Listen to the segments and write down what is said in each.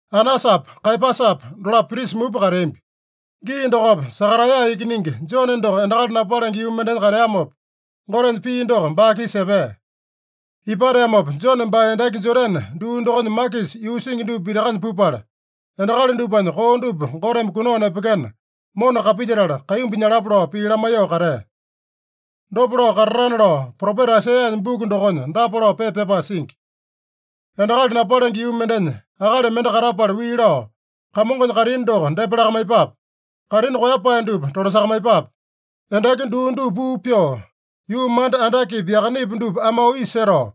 Anasapa, Kaeyapasapa dolapo prisa mupa kateambi. Gii dokopa Sakaraeya ikiningi Jone doko endakali napalenge yuu mendenya kateamopa, Gotenya pii doko baa-kisa epea. Ipateamopa Jone baa endaki Jodane duu dokonya makisa yuu singi dupa pitakanya pupala, endakali dupanya koo dupa Goteme kunao nepekena, mona kapilyetala kaimbu nyalapa lao pii lamaiyoo katea. Dopa lao katatana lao Propeta Aisaiyanya buku dokonya dapa lao pepa pyapae singi: “Endakali napalenge yuu mendenya akali mende katapala wii lao, ‘Kamongonya kaitini doko depa lakamaiyepape. Kaitini koeyapae dupa tolasakamaiyepape. Endaki duu dupa puu pyoo, yuu manda andakepi yakanepi dupa amao isa setao,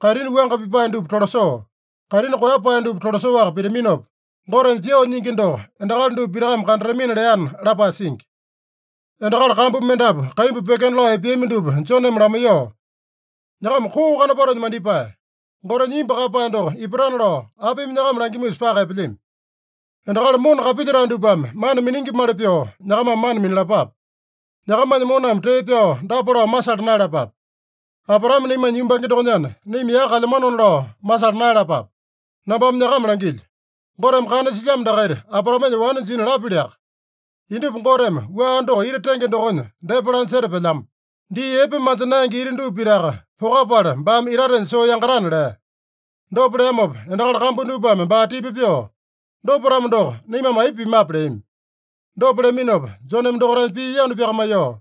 kaitini wuanga pipae dupa tolasoo, kaitini koeyapae dupa tolasoaka pitaminopa, Gotenya pyoo nyingi doko endakali dupa pitakame kandatamina’ leana” lapae singi. Endakali kambu mendapu kaimbu pyekena lao epeami dupa Joneme lamaiyoo, “Nyakama koo kanopatonya mandipae! Gotenya imbu kaeyapae doko ipatana lao apimi nyakama langimusa paka epelyami? Endakali mona kapilyetae dupame mana miningimali pyoo, nyakamame mana minalapape. Nyakamanya moname tee pyao dapa lao masala naeyalapape: ‘Abraame naimanya yumbange dokonyana, naima yaka kalyamanona’ lao masala naeyalapape. Nambame nyakama langilyo: Goteme kana silyamo dakaita Abraamenya wane jina lapyaliaka. Indupa Goteme wua doko ita tenge dokonya depa lanya setapelyamo. Dii epe manja naenge ita dupa pitaka pokapala, baame itatenya soo yangatana” lea. Dopa leamopa endakali kambu dupame baa tipa pyoo, “Dopa-tamo doko, naimame aipa pimape?” leami. Dopa leaminopa Joneme dokaitanya pii yanu pyakamaiyoo,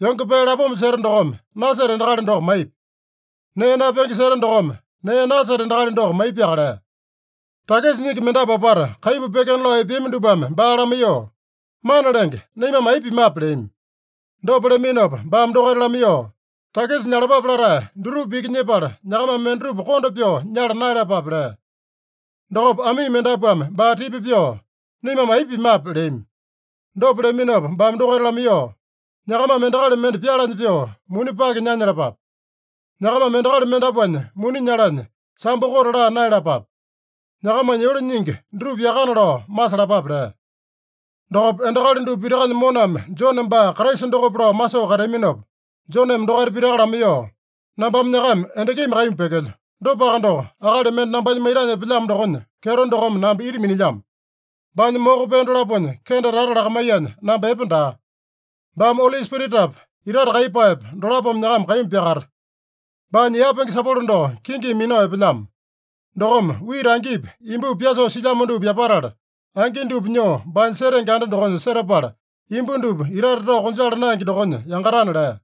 “Yonge pee lapoma seta dokome, naseta endakali doko maipi. Nee napenge seta dokome, nee naseta endakali doko maipiaka” lea. Takisa nyingi mendapu apata kaimbu pyekena lao epeami dupame baa lamaiyoo, “Mana Lenge, naimame aipa pimape?” leami. Dopa leaminopa baame dokaita lamaiyoo, “Takisa nyalapape latae dutupa iki nyepala, nyakamame mendatupa konda pyoo nyala naeyalapape” lea. Dokopa amii mendapuame baa tipa pyoo, “Naimame aipa pimape?” leami. Dopa leaminopa baame dokaita lamaiyoo, “Nyakamame endakali mende pyalanya pyoo muni pake nanyalapape. Nyakamame endakali mendapuanya muni nyalanya, sambo kote laa naeyalapape. Nyakamanya yole nyingi dutupa yakana lao masalapape” lea. Dokopa endakali dupa pitakanya moname Jone baa Kraisa dokope lao masoo kateaminopa, Joneme dokaita pitaka lamaiyoo, “Nambame nyakama endakimi kaimbu pyekelyo. Dopaka doko, akali mende nambanya maitanya epelyamo dokonya kyeto dokome namba ita minilyamo. Baanya moko pee dolaponya kende tata lakamaiyanya, namba epe daa. Baame Oli Spiritapa, itate kaiyepaepa dolapome nyakama kaimbu pyakata. Baanya yapenge sapolo doko kingimi minao epelyamo. Dokome wita angipi, imbupi pyasoo silyamo dupa yapatala, angi dupa nyoo baanya setenge anda dokonya setapala, imbu dupa itate tao konjala naenge dokonya yangatana” lea.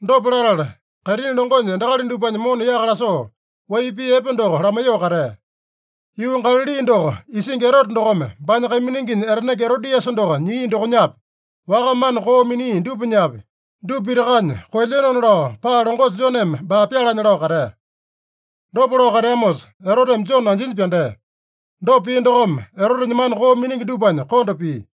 Dopa latala, kaitini longonya endakali dupanya mona yaka lasoo, wai pii epe doko lamaiyoo katea. Yuu Galali doko isingi Erote dokome baanya kaimininginya etanenge Erodiasa doko nyia dokonyapi, waka mana koo minia dupanyapi, dupa pitakanya koelyenona lao paa longosa Joneme baa pyalanya lao katea. Dopa lao kateamosa, Eroteme Jone anjinya pyandea. Dopa pia dokome, Erotenya mana koo miningi dupanya konda pia.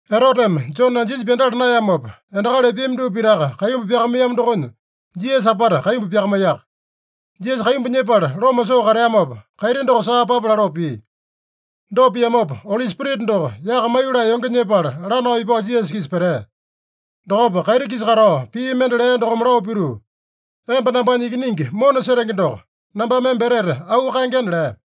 Eroteme Jone anjinya pyandala naeyamopa, endakali epeami dupa pitaka kaimbu pyakamaiyamo dokonya, Jisasa apata kaimbu pyakamaiyaka. Jisasa kaimbu nyepala loma soo kateamopa, kaiti doko saa papa laloo pia. Dopa piamopa, Oli Spirita doko yaka maiyolee yonge nyepala, lanao ipao Jisasa-kisa petea. Dokopa kaiti-kisa katao pii mende lea dokome lao pituu, “Emba nambanya Ikiningi mona setenge doko. Nambame emba etete auu kaengena” lea.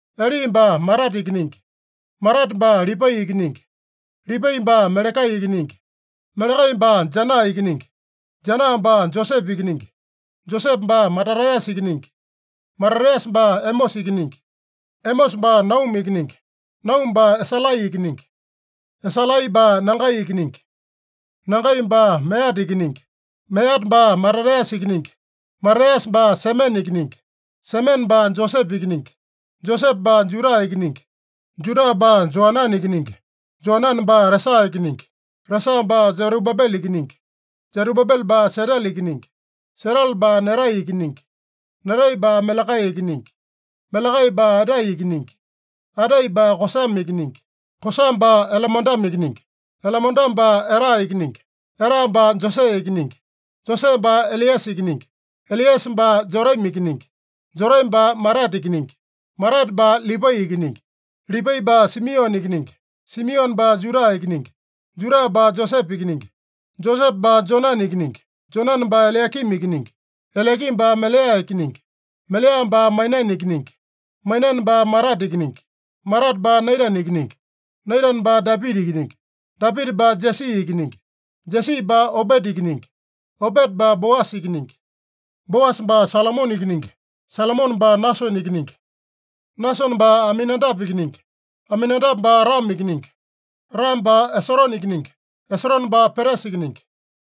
Eli baa Matate ikiningi. Matate baa Lipai ikiningi. Lipai baa Melekai ikiningi. Melekai baa Janaa ikiningi. Janaa baa Josepe ikiningi. Josepe baa Matataeyasa ikiningi. Matataeyasa baa Emosa ikiningi. Emosa baa Nauma ikiningi. Nauma baa Esalai ikiningi. Esalai baa Nagai ikiningi. Nagai baa Meata ikiningi. Meata baa Matataeyasa ikiningi. Matataeyasa baa Semene ikiningi. Semene baa Josepe ikiningi. Josepe baa Juda ikiningi. Juda baa Joanane ikiningi. Joanane baa Resa ikiningi. Resa baa Serubabele ikiningi. Serubabele baa Setele ikiningi. Setele baa Nerai ikiningi. Nerai baa Melekai ikiningi. Melekai baa Adai ikiningi. Adai baa Kosame ikiningi. Kosame baa Elemodame ikiningi. Elemodame baa Era ikiningi. Era baa Josee ikiningi. Josee baa Eliesa ikiningi. Eliesa baa Jorimi ikiningi. Jorimi baa Matate ikiningi. Matate baa Lipai ikiningi. Lipai baa Simione ikiningi. Simione baa Juda ikiningi. Juda baa Josepe ikiningi. Josepe baa Jonane ikiningi. Jonane baa Eliakimi ikiningi. Eliakimi baa Melea ikiningi. Melea baa Mainane ikiningi. Mainane baa Matata ikiningi. Matata baa Naitane ikiningi. Naitane baa Dapita ikiningi. Dapita baa Jesi ikiningi. Jesi baa Obeta ikiningi. Obeta baa Boasa ikiningi. Boasa baa Salomone ikiningi. Salomone baa Nasone ikiningi. Nasone baa Aminadape ikiningi. Aminadape baa Ramo ikiningi. Ramo baa Esorone ikiningi. Esorone baa Peresa ikiningi.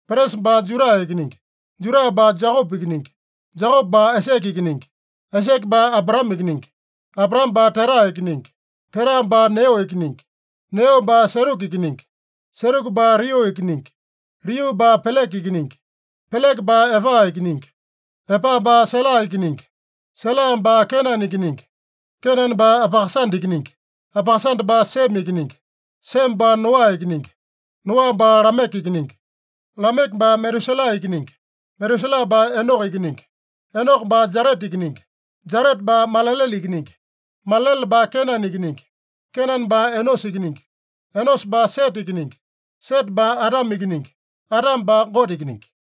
Peresa baa Juda ikiningi. Juda baa Jekope ikiningi. Jekope baa Aisake ikiningi. Aisake baa Abraame ikiningi. Abraame baa Tera ikiningi. Tera baa Neo ikiningi. Neo baa Seruka ikiningi. Seruka baa Riu ikiningi. Riu baa Peleke ikiningi. Peleke baa Epa ikiningi. Epa baa Sela ikiningi. Sela baa Kenane ikiningi. Kenane baa Apakasada ikiningi. Apakasada baa Seme ikiningi. Seme baa Noa ikiningi. Noa baa Lameke ikiningi. Lameke baa Metuselaa ikiningi. Metuselaa baa Enoko ikiningi. Enoko baa Jareta ikiningi. Jareta baa Malalele ikiningi. Malalele baa Kenane ikiningi. Kenane baa Enosa ikiningi. Enosa baa Sete ikiningi. Sete baa Adame ikiningi. Adame baa Gote ikiningi.